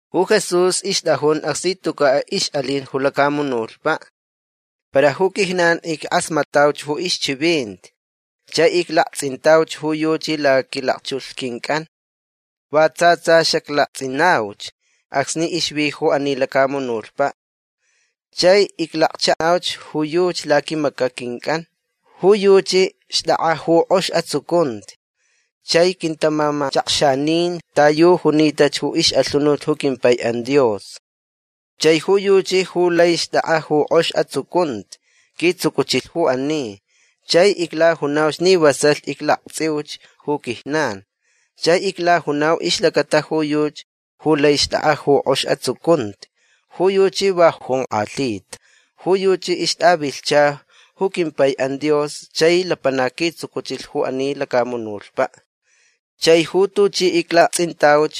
Ju Jesús ixtʼajun acsni tucaʼ ixʼalin ju lacamunutpaʼ. Para ju quijnan ickʼasmatʼauch ju ixchivinti chai iclaktsʼintauch ju yuchi laquilakchulh quincʼan. Va tsa tsa xaclaktsʼinauch acsni ixvi ju ani lacamunutpaʼ. Chai iclakchaʼauch ju yuchi laquimacaʼ quincʼan. Ju yuchi xtʼakʼa ju kʼox atsucunti. Chai quintamamachakxanin ta yu junita ju ixʼalhunut ju quimpaiʼan Dios. Chai ju yuchi ju lai xtʼakʼa ju kʼox atsucunti quitsucuchilh ju ani. Chai iclajunauch ni vasalh iclaktsʼiuch ju quijnan. Chai iclajunau ixlacata ju yuchi ju lai xtʼakʼa ju kʼox atsucunti. Ju yuchi va jonkʼalhita. Ju yuchi ixtʼavilhcha ju quimpaiʼan Dios chai lapanac quitsucuchilh ju ani lacamunutpaʼ. Chai ju tuchi iclaktsʼintauch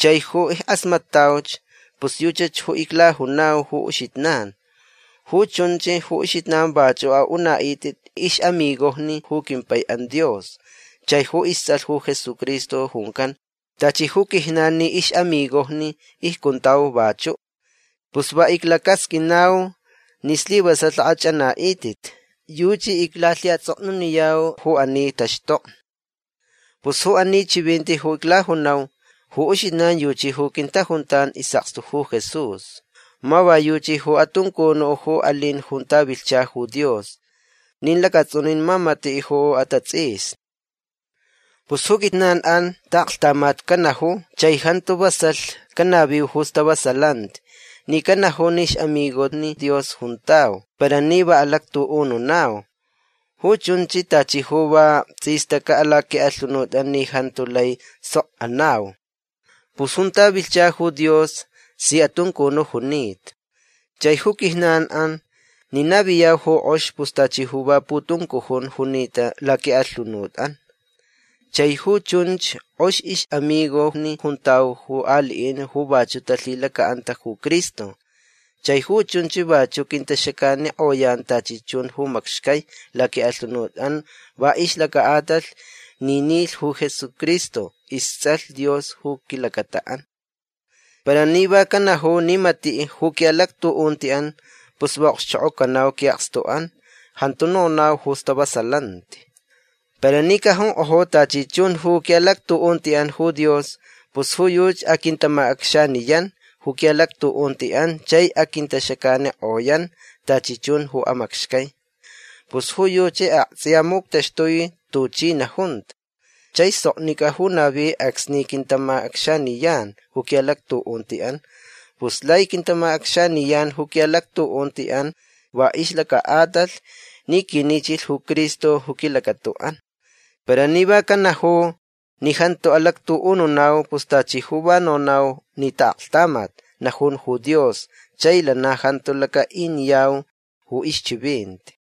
chai ju ickʼasmatʼauch pus yuchach ju iclajunau ju uxijnan. Ju chunch ju uxijnan vachuʼ aʼunaʼitʼit ixʼamigojni ju quimpaiʼan Dios chai ju istsʼalh ju Jesucristo juncan. Tachi ju quijnan ni ixʼamigojni icjuntau vachuʼ. Pus va iclacasqʼuinau ni slivasalh akʼachʼanaʼitʼit. Yuchi iclalhiʼatsʼoknuniyau ju ani taxtokni. Pus ju ani chivinti ju aclajunau ju uxijnan yuchi ju quintajuntan isʼakstu ju Jesús. Ma va yuchi ju atuncunuʼ ju alin junta vilhcha ju Dios. Nin lacatsʼunin ma matiʼ ju atatsʼisni. Pus ju quijnanʼan taʼaklhtamat canaju chai jantu vasalh canaviu ju stavasalanti ni canaju ni ixʼamigojni Dios juntau para ni va alactuʼununau. Ju chunch tachi ju va tsʼistacaʼ laquiʼalhunutʼan ni jantu lai sok anau. Pus junta vilhcha ju Dios si atuncunuʼ junita. Chai ju quijnanʼan ni naviyau ju kʼox pus tachi ju va putuncujun junita laquiʼalhunutʼan. Chai ju chunch kʼox ixʼamigojni juntau ju aliʼin ju vachuʼ talhilacaʼanta ju Cristo. Chai ju chunch vachuʼ quintaxacanikʼoyan tachi chun ju macxcai laquiʼalhunutʼan va ixlacaʼatalh ni nilh ju Jesucristo istsʼalh Dios ju quilacataʼan. Para ni va canaju ni matiʼ ju quiʼalactuʼuntiʼan pus va okxchokʼocanau quiʼakstuʼan. Jantu nonau ju stavasalanti. Para ni cajunkʼoju tachi chun ju quiʼalactuʼuntiʼan ju Dios pus ju yuchi aquintamacʼacxaniyan ju quiʼalactuʼuntiʼan chai aquintaxacanikʼoyan tachi chun ju amacxcai. Pus ju yuchi aktsʼiya muctaxtui tuchi najunta. Chai soknicʼa ju navi acsni quintamacʼacxaniyan ju quiʼalactuʼuntiʼan. Pus lai quintamacʼacxaniyan ju quiʼalactuʼuntiʼan va ixlacaʼatalh ni quinichilh ju Cristo ju quilacataʼan. Para ni va canaju ni jantu alactuʼununau pus tachi ju va nonau ni taʼaklhtamat najun ju Dios chai lana jantu lacaʼiniyau ju ixchivinti.